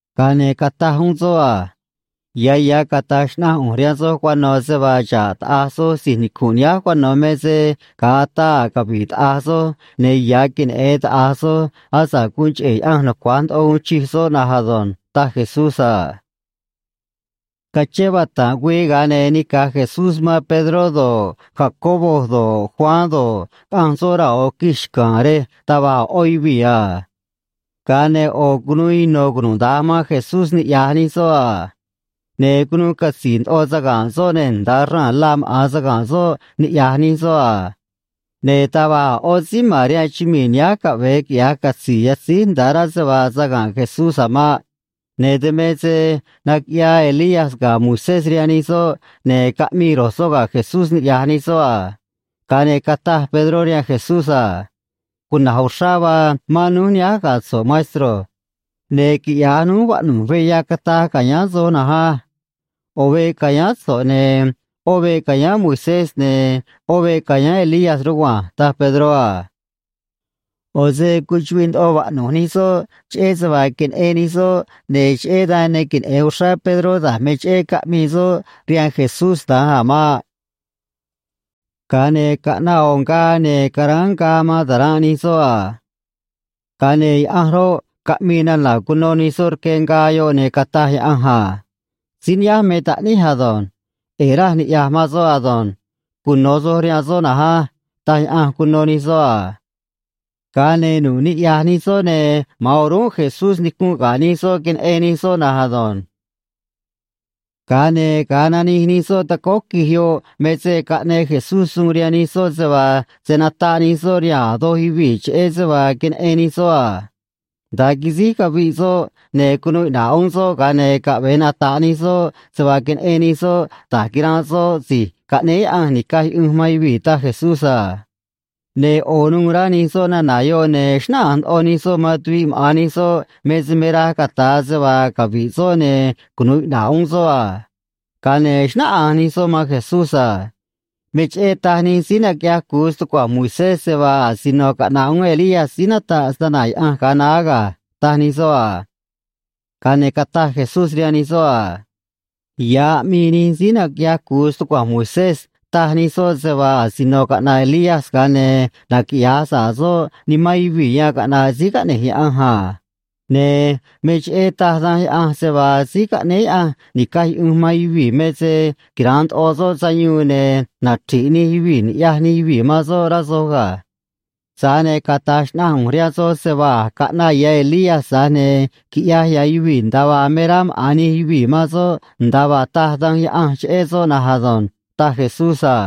Ga̱a ne̱ cataj uún soꞌ a: ―Ya̱ ya̱ cata̱j xnaꞌanj ꞌu̱nj rihaan soj cuano̱ se vaa xa̱ꞌ taꞌa̱j soj si̱j nicu̱nꞌ nihánj cuano̱, me se ga̱a ataa a̱ cavi̱ꞌ taꞌa̱j soj, ne̱ ya̱ queneꞌe̱n taꞌa̱j soj asa̱ꞌ guun cheꞌe̱ Yaꞌanj nucua̱j ndoꞌo uun chij soꞌ na̱nj ado̱nj ―taj Jesús a. Cachén vata̱nꞌ güii, ga̱a ne̱ nica̱j Jesús man Pedró do̱ꞌ, Jacobo do̱ꞌ, Juan do̱ꞌ, caꞌanj soꞌ raa̱ ꞌo̱ quij xca̱a̱n rej taj va̱j a̱ ꞌó yuvii̱ a. Ga̱a ne̱ ꞌo̱ cunuu ino̱ cunuda̱nj man Jesús niꞌya̱j nij soꞌ a. Ne̱ cunuu catzi̱i̱ ndoꞌo saga̱nꞌ soꞌ, ne̱ nda̱a raa̱n la maꞌa̱n saga̱nꞌ soꞌ niꞌya̱j nij soꞌ a. Ne̱ taj va̱j a̱ ꞌó síí ma̱n rihaan chumii̱ nihánj caꞌve̱e quiꞌya̱j catzi̱i̱ yatzíj nda̱a rá se vaa saga̱nꞌ Jesús a̱ maꞌ. Ne̱ dan me se naquiꞌyaa Elías ga̱ Moisés rihaan nij soꞌ, ne̱ caꞌmii ro̱j soꞌ ga̱ Jesús niꞌya̱j nij soꞌ a. Ga̱a ne̱ cataj Pedró rihaan Jesús a: ―Cuna̱j uxrá vaa mán núj nihánj ga̱ so̱ꞌ, maestro. Ne̱ quiꞌya̱j núj vaꞌnu̱j veꞌ yacataj ca̱yáán soj na̱nj á. ꞌO̱ veꞌ ca̱yáán so̱ꞌ, ne̱ ꞌó veꞌ ca̱yáán Moisés, ne̱ ꞌó veꞌ ca̱yáán Elías rugua̱nj ―taj Pedró a. ꞌO̱ se cuchuꞌviꞌ ndoꞌo vaꞌnu̱j nij soꞌ cheꞌé se vaa queneꞌen nij soꞌ, ne̱ cheꞌé dan ne queneꞌe̱n uxrá Pedró da̱j me cheꞌé caꞌmii soꞌ rihaan Jesús da̱nj a̱ maꞌ. Ga̱a ne̱ caꞌnaꞌ ꞌo̱ ngaa, ne̱ caráán ngaa man ta̱ranꞌ nij soꞌ a. Ga̱a ne̱ Yaꞌanj roꞌ, caꞌmii nana̱ cuno nij soꞌ rque ngaa yoꞌ, ne̱ cataj Yaꞌanj a: ―Síí nihánj me taꞌníj ado̱nj. ꞌE̱e̱ raj niꞌya̱j man soꞌ ado̱nj. Cuno̱ soj rihaan soꞌ na̱nj á ―taj Yaꞌanj cuno nij soꞌ a. Ga̱a ne̱ nu̱ꞌ niꞌya̱j nij soꞌ, ne̱ ma̱an o̱rúnꞌ Jesús nicu̱nꞌ ga̱ nij soꞌ, queneꞌen nij soꞌ na̱nj ado̱nj. Ga̱a ne̱ ga̱a nanij nij soꞌ tacóó quij yoꞌ me se caꞌneꞌ Jesús suun rihaan nij soꞌ se vaa se̱ nataꞌ nij soꞌ rihaan a̱ doj yuvii̱ cheꞌé se vaa queneꞌen nij soꞌ a. Nda̱a quisíj caviꞌ soꞌ ne̱ cunuu iꞌna̱ꞌ uún soꞌ, ga̱a ne̱ caꞌve̱e nata̱ꞌ nij soꞌ se vaa queneꞌen nij soꞌ da̱j quiranꞌ soꞌ Si̱j Caꞌnéé Yaꞌanj Ni̱caj Yuꞌunj man Yuvii̱, taj Jesús a. Ne̱ ꞌo̱ nuû rá nij soꞌ nana̱ yoꞌ, ne̱ xnáꞌanj ndoꞌo nij soꞌ man tuviꞌ maꞌa̱n nij soꞌ me se me raj cata̱a se vaa cavi̱ꞌ soꞌ ne̱ cunu̱u iꞌna̱ꞌ uún soꞌ a. Ga̱a ne̱ xnáꞌanj nij soꞌ man Jesús a: ―Me cheꞌé taj nij síí naquiꞌyaj cu̱u stucua̱nj Moisés se vaa asino caꞌna̱ꞌ uún Elías síí nataꞌ snana̱ Yaꞌanj ga̱a naá ga̱ ―taj nij soꞌ a. Ga̱a ne̱ cataj Jesús rihaan nij soꞌ a: ―Ya̱ aꞌmii nij síí naquiꞌyaj cu̱u stucua̱nj Moisés, taj nij soꞌ se vaa asino caꞌna̱ꞌ Elías, ga̱a ne̱ naquiꞌya̱j sa̱ꞌ soꞌ nimán yuvii̱ yan caꞌna̱ꞌ Síí Caꞌne̱j Yaꞌanj a. Ne̱ me cheꞌé taj Danj Yaꞌanj se vaa Síí Caꞌnéé Yaꞌanj Ni̱caj Yuꞌunj man Yuvii̱ me se quira̱nꞌ ndoꞌo soꞌ sayuun ne̱ nachri̱ꞌ nij yuvii̱ ni̱ꞌyaj nij yuvii̱ man soꞌ, rá soj ga̱. Tza̱j ne̱ cata̱j xnaꞌanj ꞌu̱nj rihaan soj se vaa a̱j caꞌnaꞌ ya̱ Elías, tza̱j ne̱ quiꞌyaj ya̱ yuvii̱ nda̱a vaa me rá maꞌa̱n nij yuvii̱ man soꞌ nda̱a vaa taj Danj Yaꞌanj cheꞌé soꞌ na̱nj ado̱nj ―taj Jesús a.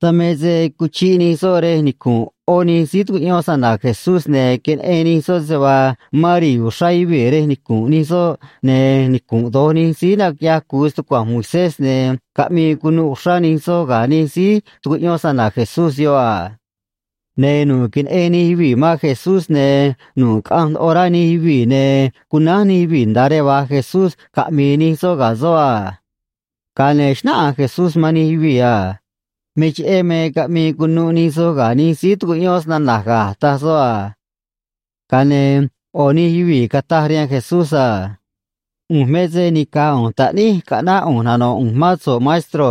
Dan me se cuchiꞌ nij soꞌ rej nicu̱nꞌ ꞌó nij síí tucuꞌyón snana̱ Jesús, ne̱ queneꞌen nij soꞌ se vaa mán ri̱i̱ uxrá yuvii̱ rej nicu̱nꞌ nij soꞌ, ne̱ nicu̱nꞌ do̱j nij síí naquiꞌyaj cu̱u stucua̱nj Moisés, ne̱ caꞌmii cunuꞌ uxrá nij soꞌ ga̱ nij síí tucuꞌyón snana̱ Jesús yoꞌ a. Ne̱ nu̱ꞌ queneꞌen nij yuvii̱ man Jesús, ne̱ nu̱ꞌ caꞌanj ndoꞌo rá nij yuvii̱, ne̱ cunánj nij yuvii̱ nda̱a rej va̱j Jesús caꞌmi̱i̱ nij soꞌ ga̱ soꞌ a. Ga̱a ne̱ xnáꞌanj Jesús man nij yuvii̱ a: ―Me cheꞌé me caꞌmii cunuꞌ nij soj ga̱ nij síí tucuꞌyón snana̱j ga̱ ―taj soꞌ a. Ga̱a ne̱ ꞌo̱ nij yuvii̱ cataj rihaan Jesús a: ―ꞌU̱nj me se nica̱j ꞌu̱nj taꞌníj caꞌnáꞌ ꞌu̱nj nano̱ꞌ ꞌu̱nj mán so̱ꞌ, maestro.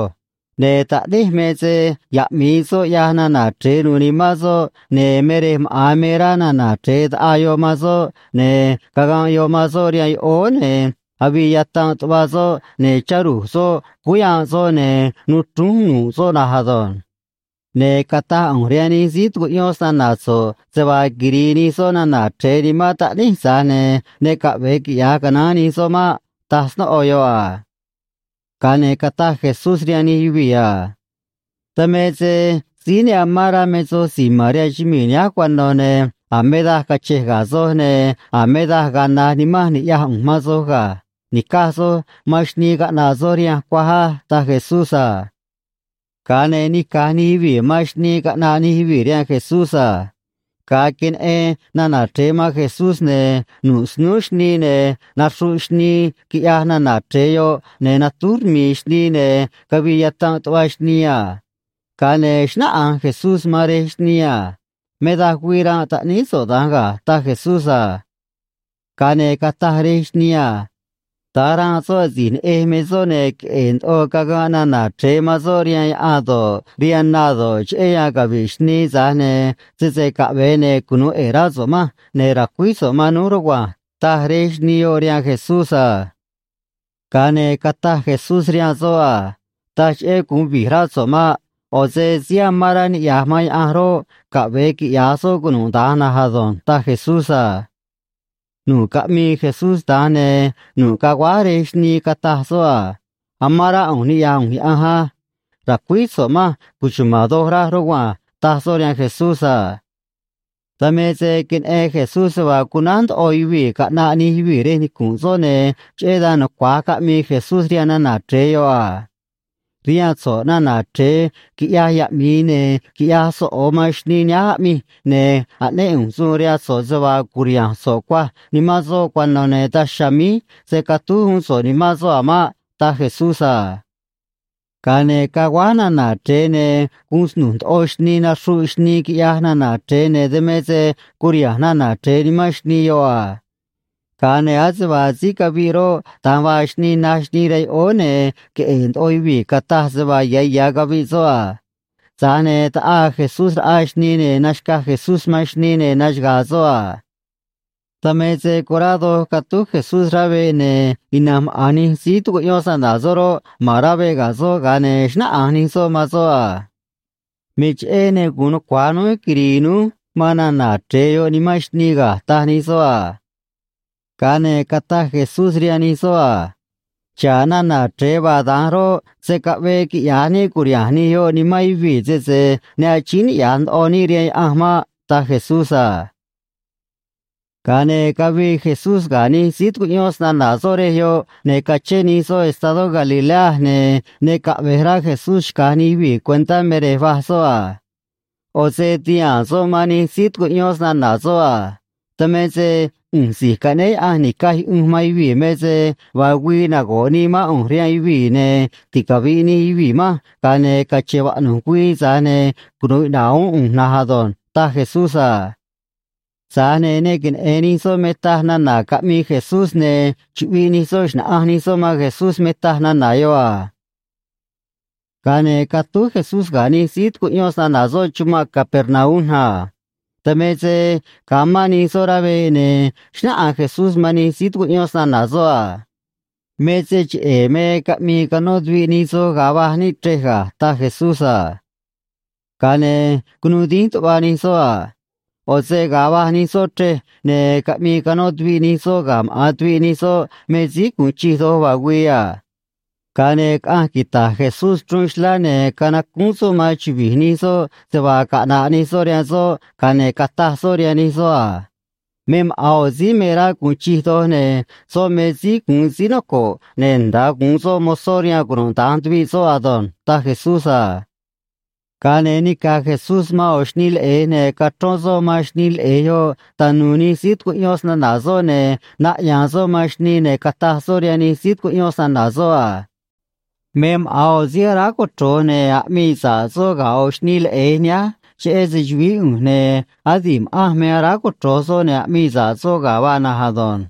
Ne̱ taꞌníj me se yaꞌmi̱i soꞌ ꞌyaj nana̱ chre̱e nu̱u̱ nimán soꞌ, ne̱ me rej maꞌa̱n me rá nana̱ chre̱e ta̱ꞌaa yoꞌ man soꞌ, ne̱ caganꞌ yoꞌ man soꞌ rihaan yoꞌóó, ne̱ avii yatanꞌ tuꞌva soꞌ, ne̱ chá ru̱j soꞌ cúú yanꞌ soꞌ, ne̱ nuu chrúnj nu̱ꞌ soꞌ na̱nj ado̱nj. Ne̱ cataj ꞌu̱nj rihaan nij síí tucuꞌyón snana̱ so̱ꞌ se vaa quiri̱i̱ nij soꞌ nana̱ chre̱e nimán taꞌníj, tza̱j ne̱ ne caꞌve̱e quiꞌya̱j canaán nij soꞌ maꞌ ―taj snóꞌo yoꞌ a. Ga̱a ne̱ cataj Jesús rihaan nij yuvii̱ a: ―Dan me se síí ne amán rá me soj si̱j ma̱n rihaan chumii̱ nihánj cuano̱, ne̱ a̱ me daj cache̱j ga̱ soj, ne̱ a̱ me daj ga̱a̱ naj nimanj ni̱ꞌyaj ꞌu̱nj man soj ga̱. Ni̱caj soj man xnii caꞌna̱ꞌ soj rihanj cuaj á ―taj Jesús a. Ga̱a ne̱ nica̱j nij yuvii̱ man xnii caꞌnaꞌ nij yuvii̱ rihaan Jesús a. Ga̱a queneꞌen nana̱ chre̱e man Jesús, ne̱ nu̱ꞌ snúú xnii, ne̱ naxruꞌ xnii, quiꞌyaj nana̱ chre̱e yoꞌ, ne̱ natúj rmi̱i̱ xnii, ne̱ cavii yatanꞌ tuꞌva xnii a. Ga̱a ne̱ xnáꞌanj Jesús man rej xnii a: ―Me daj güii ranꞌ taꞌníí so̱ꞌ da̱nj ga̱ ―taj Jesús a. Ga̱a ne̱ cataj rej xnii a: ―Da̱nj ranꞌ soꞌ asi̱j neꞌej me soꞌ, ne̱ queꞌe̱e̱ ndoꞌo caganꞌ nana̱ chre̱e man soꞌ rihaan yaꞌan do̱ꞌ, rihaan na do̱ꞌ, cheꞌé yan cavi̱ꞌ xnii, tza̱j ne̱ sese caꞌve̱e, ne̱ cunu̱u ꞌe̱e̱ rá so̱ꞌ manj ne̱ ra̱cuíj so̱ꞌ man núj rugua̱nj ―taj rej xnii yoꞌ rihaan Jesús a. Ga̱a ne̱ cataj Jesús rihaan soꞌ a: ―Taj cheꞌé gu̱un vi̱j rá so̱ꞌ maꞌ. ꞌO̱ se síí amán rá niꞌya̱j man Yaꞌanj roꞌ, caꞌve̱e quiꞌya̱j soꞌ cunuda̱nj na̱nj ado̱nj ―taj Jesús a. Nu̱ꞌ caꞌmii Jesús da̱nj, ne̱ nu̱ꞌ caguáj rej xnii, cataj soꞌ a: ―Amán rá ꞌu̱nj niꞌya̱j ꞌu̱nj Yaꞌanj á. Ra̱cuíj so̱ꞌ manj cuchuma̱n doj raj, rugua̱nj ―taj soꞌ rihaan Jesús a. Dan me se queneꞌen Jesús se vaa cunánj ndoꞌo yuvii̱ caꞌna̱ꞌ nij yuvii̱ rej nicu̱nꞌ soꞌ, ne̱ cheꞌé dan nucua̱j caꞌmii Jesús rihaan nana̱ chre̱e yoꞌ a: ―Rihaan so̱ꞌ na̱na̱ chre̱e quiꞌyaj yaꞌmi̱i ne̱ quiꞌyaj soꞌo̱ man xnii nihánj aꞌmij, ne̱ aꞌnéꞌ ꞌu̱nj suun rihaan so̱ꞌ se vaa cu̱riha̱nj so̱ꞌ cuaj nimán soꞌ cuano̱, ne̱ daj chiha̱a̱ míj se̱ catúj uún so̱ꞌ nimán soꞌ a̱ maꞌ ―taj Jesús a. Ga̱a ne̱ caguáj nana̱ chre̱e, ne̱ guun snu̱j ndoꞌo xnii naxruꞌ xnii, quiꞌyaj nana̱ chre̱e, ne̱ dan me se curiha̱nj nana̱ chre̱e nimán xnii yoꞌ a. Ga̱a ne̱ ase vaa síí caviꞌ roꞌ, da̱nj vaa xnii, naj xnii rihaan yoꞌóó, ne̱ queꞌe̱e̱ ndoꞌo yuvii̱ cataj se vaa ya̱ ya̱ caviꞌ soꞌ a. Tza̱j ne̱ taꞌaa Jesús raꞌa xnii, ne̱ naxca̱j Jesús man xnii, ne̱ naxaga̱a̱ soꞌ a. Dan me se corá doj catúj Jesús rá veꞌ, ne̱ ina̱nj maꞌa̱n nij síí tucuꞌyón snana̱ soꞌ roꞌ, ma̱n rá veꞌ ga̱ soꞌ, ga̱a ne̱ xnáꞌanj nij soꞌ man soꞌ a: ―Me cheꞌé ne gu̱un nucua̱j núj quiri̱i̱ núj man nana̱ chre̱e yoꞌ nimán xnii ga̱ ―taj nij soꞌ a. Ga̱a ne̱ cataj Jesús rihaan nij soꞌ a: ―Xa̱ꞌ nana̱ chre̱e vaa da̱nj roꞌ, se̱ caꞌvee quiꞌya̱j níꞌ cu̱riha̱nj nij yoꞌ nimán yuvii̱ sese ne achíín niꞌya̱j ndoꞌo níꞌ rihaan Yaꞌanj maꞌ ―taj Jesús a. Ga̱a ne̱ cavii Jesús ga̱ nij síí tucuꞌyón snana̱ soꞌ rej yoꞌ, ne̱ cachén nij soꞌ estadó Galilea, ne̱ ne caꞌve̱j rá Jesús xca̱j nij yuvii̱ cuentá me rej va̱j soꞌ a. ꞌO̱ se tihaa̱n soꞌ man nij síí tucuꞌyón snana̱ soꞌ a: ―Dan me se ꞌu̱nj Si̱j Caꞌnéé Yaꞌanj Ni̱caj Yuꞌunj man Yuvii̱ me se vaa güii nago̱ꞌ nii mán ꞌu̱nj rihaan yuvii̱, ne̱ ticavi̱ꞌ nij yuvii̱ manj, ga̱a ne̱ cache̱n vaꞌnu̱j güii, tza̱j ne̱ cunu̱u iꞌna̱ꞌ uún ꞌu̱nj na̱nj ado̱nj ―taj Jesús a. Tza̱j ne̱ ne queneꞌe̱n nij soꞌ me taj nana̱ caꞌmii Jesús, ne̱ chuꞌviꞌ nij soꞌ xna̱ꞌanj nij soꞌ man Jesús me taj nana̱ yoꞌ a. Ga̱a ne̱ catúj Jesús ga̱ nij síí tucuꞌyón snana̱ soꞌ chumanꞌ Capernaum a. Dan me se ga̱a mán nij soꞌ rá veꞌ, ne̱ xnáꞌanj Jesús man nij síí tucuꞌyón snana̱ soꞌ a: ―Me se cheꞌe̱ me caꞌmii canó tuviꞌ nij soj ga̱a va̱j níꞌ chrej ga̱ ―taj Jesús a. Ga̱a ne̱ cunuu dínj tuꞌva nij soꞌ a. ꞌO̱ se ga̱a va̱j nij soꞌ chrej, ne̱ caꞌmii canó tuviꞌ nij soꞌ ga̱ maꞌa̱n tuviꞌ nij soꞌ me síí gu̱un chij doj vaa güii a. Ga̱a ne̱ caꞌanj quita̱j Jesús chruun xlá, ne̱ canacúún soꞌ man chuvi̱j nij soꞌ se vaa caꞌna̱ꞌ nij soꞌ rihaan soꞌ, ga̱a ne̱ cataj soꞌ rihaan nij soꞌ a: ―Me maꞌa̱n ꞌo̱ síí me rá gu̱un chij doj, ne̱ soꞌ me síí gu̱un síí noco̱ꞌ, ne̱ nda̱a gu̱un soꞌ mozó rihaan cunuda̱nj tuviꞌ soꞌ ado̱nj ―taj Jesús a. Ga̱a ne̱ nica̱j Jesús man ꞌo̱ xnii leꞌe̱j, ne̱ cachrón soꞌ man xnii leꞌe̱j yoꞌ tanu̱u̱ nij síí tucuꞌyón snana̱ soꞌ, ne̱ naꞌya̱a̱n soꞌ man xnii, ne̱ cataj soꞌ rihaan nij síí tucuꞌyón snana̱ soꞌ a: ―Me maꞌa̱n ꞌo̱ síí aráj cochro̱j ne̱ aꞌmii sa̱ꞌ soꞌ ga̱ ꞌo̱ xnii leꞌe̱j nihánj cheꞌé se‑chu̱vií ꞌu̱nj, ne̱ adi̱ꞌ ma̱ꞌanj me aráj cochro̱j soꞌ ne̱ aꞌmii sa̱ꞌ soꞌ ga̱ vaa na̱nj ado̱nj.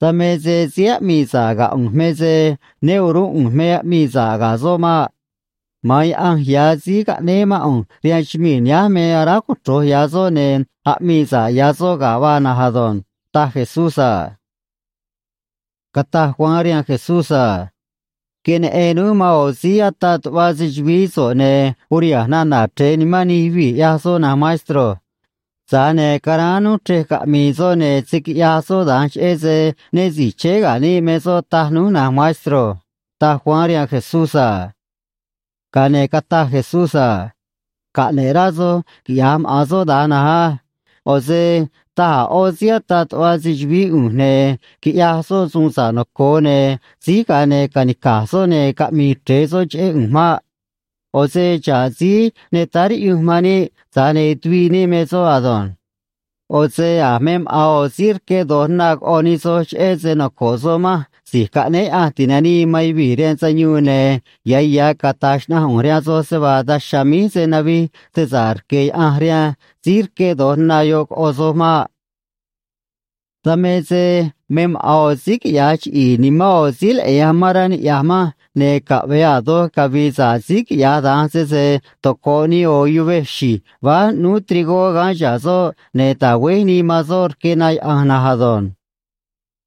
Dan me se síí aꞌmii sa̱ꞌ ga̱ ꞌu̱nj me se né o̱rúnꞌ ꞌu̱nj me aꞌmii sa̱ꞌ soꞌ ga̱ maꞌ. Ma̱an Yaꞌanj ya̱ síí caꞌnéé mán ꞌu̱nj rihaan chumii̱ nihánj me aráj cochro̱j ya̱ soꞌ ne̱ aꞌmii sa̱ꞌ ya̱ soꞌ ga̱ vaa na̱nj ado̱nj ―taj Jesús a. Cataj Juan rihaan Jesús a: ―Queneꞌen núj man ꞌo̱ síí ataꞌ tuꞌva se‑chu̱vií so̱ꞌ, ne̱ uriha̱nj nana̱ chre̱e nimán nij yuvii̱, ꞌyaj soꞌ, na̱nj maestro. Tza̱j ne̱ caráán núj chrej caꞌmi̱i̱ soꞌ ne̱ se̱ quiꞌyaj soꞌ da̱nj, cheꞌé se né si̱j chéé ga̱ níꞌ me soꞌ, taj núj, na̱nj maestro ―taj Juan rihaan Jesús a. Ga̱a ne̱ cataj Jesús a: ―Caꞌne̱ꞌ rá soj quiꞌya̱j maꞌa̱n soꞌ da̱nj na̱nj á. ꞌO̱ se taj a̱ ꞌó síí ataꞌ tuꞌva se‑chu̱vií ꞌu̱nj ne̱ quiꞌyaj soꞌ suun sa̱ꞌ noco̱o, ne̱ síj, ga̱a ne̱ ca̱nica̱j soꞌ ne̱ caꞌmi̱i̱ chre̱e soꞌ cheꞌé ꞌu̱nj maꞌ. ꞌO̱ se xa̱ꞌ síí ne táá riꞌyunj man níꞌ, tza̱j ne̱ tuviꞌ níꞌ me soꞌ ado̱nj. ꞌO̱ se a̱ me maꞌa̱n ꞌo̱ síí rqué do̱j na coꞌo̱ nij soj cheꞌé se noco̱ꞌ soꞌ manj Si̱j Caꞌnéé Yaꞌanj Ti̱nanii man Yuvii̱ rihaan Sayuun, ne̱ ya̱ ya̱ cata̱j xnaꞌanj ꞌu̱nj rihaan soj se vaa daj chiha̱a̱ míj se̱ navij se sa̱ꞌ rque̱ Yaꞌanj rihaan síí rqué do̱j na yoꞌ coꞌo soj maꞌ. ’Dan me se me maꞌa̱n ꞌo̱ síí quiꞌya̱j chiꞌi̱i̱ nimán ꞌo̱ síí leꞌe̱j amán rá niꞌya̱j manj, ne̱ caꞌve̱e a̱ doj cavi̱i̱ sa̱ꞌ síí quiꞌyaj da̱nj sese toco̱ꞌ nii ꞌo̱ yuvej xi̱j váj ꞌnúú trigó gaán chihá soꞌ ne̱ ta̱güéj nii man soꞌ rque na yaꞌa̱nj na̱nj ado̱nj.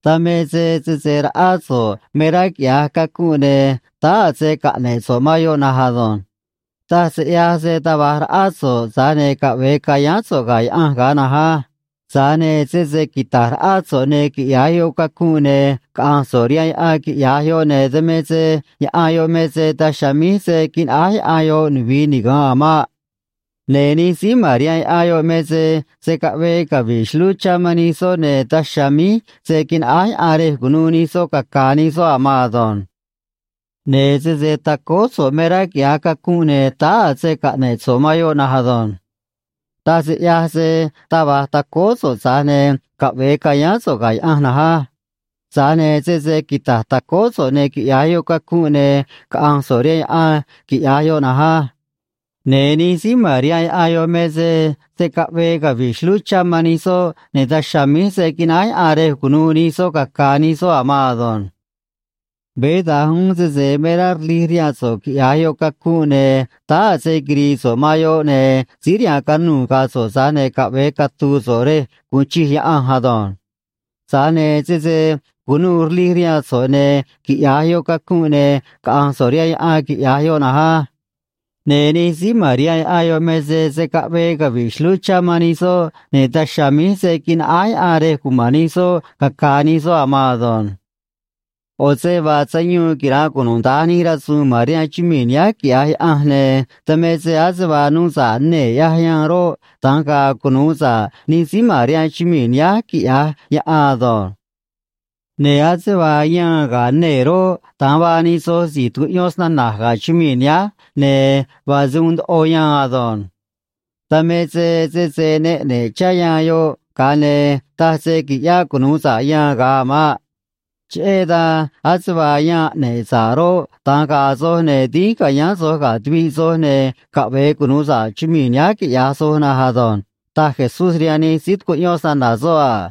’Dan me se sese raꞌá so̱ꞌ me rá quiꞌya̱j cacunꞌ, ne̱ táá a̱ se caꞌne̱ꞌ so̱ꞌ man yoꞌ na̱nj ado̱nj. Taj se ꞌyaj se taj va̱j raꞌá so̱ꞌ, tza̱j ne̱ caꞌve̱e ca̱yáán so̱ꞌ ga̱ Yaꞌanj ga̱a na̱nj á. Tza̱j ne̱ sese quita̱j raꞌá so̱ꞌ ne̱ quiꞌya̱j yoꞌ cacunꞌ, ne̱ caꞌa̱nj so̱ꞌ rihaan yaꞌan, quiꞌya̱j yoꞌ, ne̱ dan me se yaꞌan yoꞌ me se daj chiha̱a̱ míj se̱ quinaꞌáj yaꞌan yoꞌ nuvi̱i niga̱nꞌ a̱ maꞌ. Ne̱ nij síí ma̱n rihaan yaꞌan yoꞌ me se se̱ caꞌvee cavi̱ꞌ xlúú chá man nij soꞌ, ne̱ daj chiha̱a̱ míj se̱ quinaꞌáj yaꞌan rej cu̱nuû nij soꞌ caca̱a̱ nij soꞌ a̱ maan ado̱nj. ’Ne̱ sese tacóó so̱ꞌ me rá quiꞌya̱j cacunꞌ, ne̱ táá a̱ se caꞌne̱ꞌ so̱ꞌ man yoꞌ na̱nj ado̱nj. Taj se ꞌyaj se taj va̱j tacóó so̱ꞌ, tza̱j ne̱ caꞌve̱e ca̱yáán so̱ꞌ ga̱ Yaꞌanj na̱nj á. Tza̱j ne̱ sese quita̱j tacóó so̱ꞌ ne̱ quiꞌya̱j yoꞌ cacunꞌ, ne̱ caꞌa̱nj so̱ꞌ rihaan yaꞌan, quiꞌya̱j yoꞌ na̱nj á. Ne̱ nij síí ma̱n rihaan yaꞌan yoꞌ me se se̱ caꞌvee cavi̱ꞌ xlúú chá man nij soꞌ, ne̱ daj chiha̱a̱ míj se̱ quinaꞌáj yaꞌan rej cu̱nuû nij soꞌ caca̱a̱ nij soꞌ a̱ maan ado̱nj. ’Veé da̱nj uún sese me rá rlij rihaan so̱ꞌ quiꞌya̱j yoꞌ cacunꞌ, ne̱ táá a̱ se quiri̱i̱ so̱ꞌ man yoꞌ, ne̱ síí rihaan canuu̱ ga̱a̱ so̱ꞌ, tza̱j ne̱ caꞌve̱e catu̱u̱ so̱ꞌ rej gu̱un chij Yaꞌanj ado̱nj. Tza̱j ne̱ sese cu̱nuû rlij rihaan so̱ꞌ ne̱ quiꞌya̱j yoꞌ cacunꞌ, ne̱ caꞌa̱nj so̱ꞌ rihaan yaꞌan, quiꞌya̱j yoꞌ na̱nj á. Ne̱ nij síí ma̱n rihaan yaꞌan yoꞌ me se se̱ caꞌvee cavi̱ꞌ xlúú chá man nij soꞌ, ne̱ daj chiha̱a̱ míj se̱ quinaꞌáj yaꞌan rej cuma̱n nij soꞌ caca̱a̱ nij soꞌ a̱ maan ado̱nj. ’ꞌO̱ se vaa sayuun quira̱nꞌ cunuda̱nj nij rasu̱u̱n ma̱n rihaan chumii̱ nihánj, quiꞌya̱j Yaꞌanj, ne̱ dan me se ase vaa nuu sa̱ꞌ nee̱ ꞌyaj yaan roꞌ, da̱nj ga̱a̱ cunu̱u sa̱ꞌ nij síí ma̱n rihaan chumii̱ nihánj, quiꞌya̱j yaꞌan ado̱nj. ’Ne̱ ase vaa yaan ga̱ nee̱ roꞌ, da̱nj vaa nij soj si̱j tucuꞌyón snana̱j ga̱ chumii̱ nihánj, ne̱ vaa se uun ndoꞌo yaan ado̱nj. Dan me se sese ne ꞌne̱ꞌ chá yaan yoꞌ, ga̱a ne̱ taj se qui̱ꞌyáꞌ cunu̱u sa̱ꞌ yaan ga̱a a̱ maꞌ. Cheꞌé dan, ase vaa yaan ꞌne̱ꞌ sa̱ꞌ roꞌ, da̱nj ga̱a̱ soj, ne̱ dínj ca̱yáán soj ga̱ tuviꞌ soj, ne̱ caꞌve̱e cunu̱u sa̱ꞌ chumii̱ nihánj quiꞌya̱j soj na̱nj ado̱nj ―taj Jesús rihaan nij síí tucuꞌyón snana̱ soꞌ a.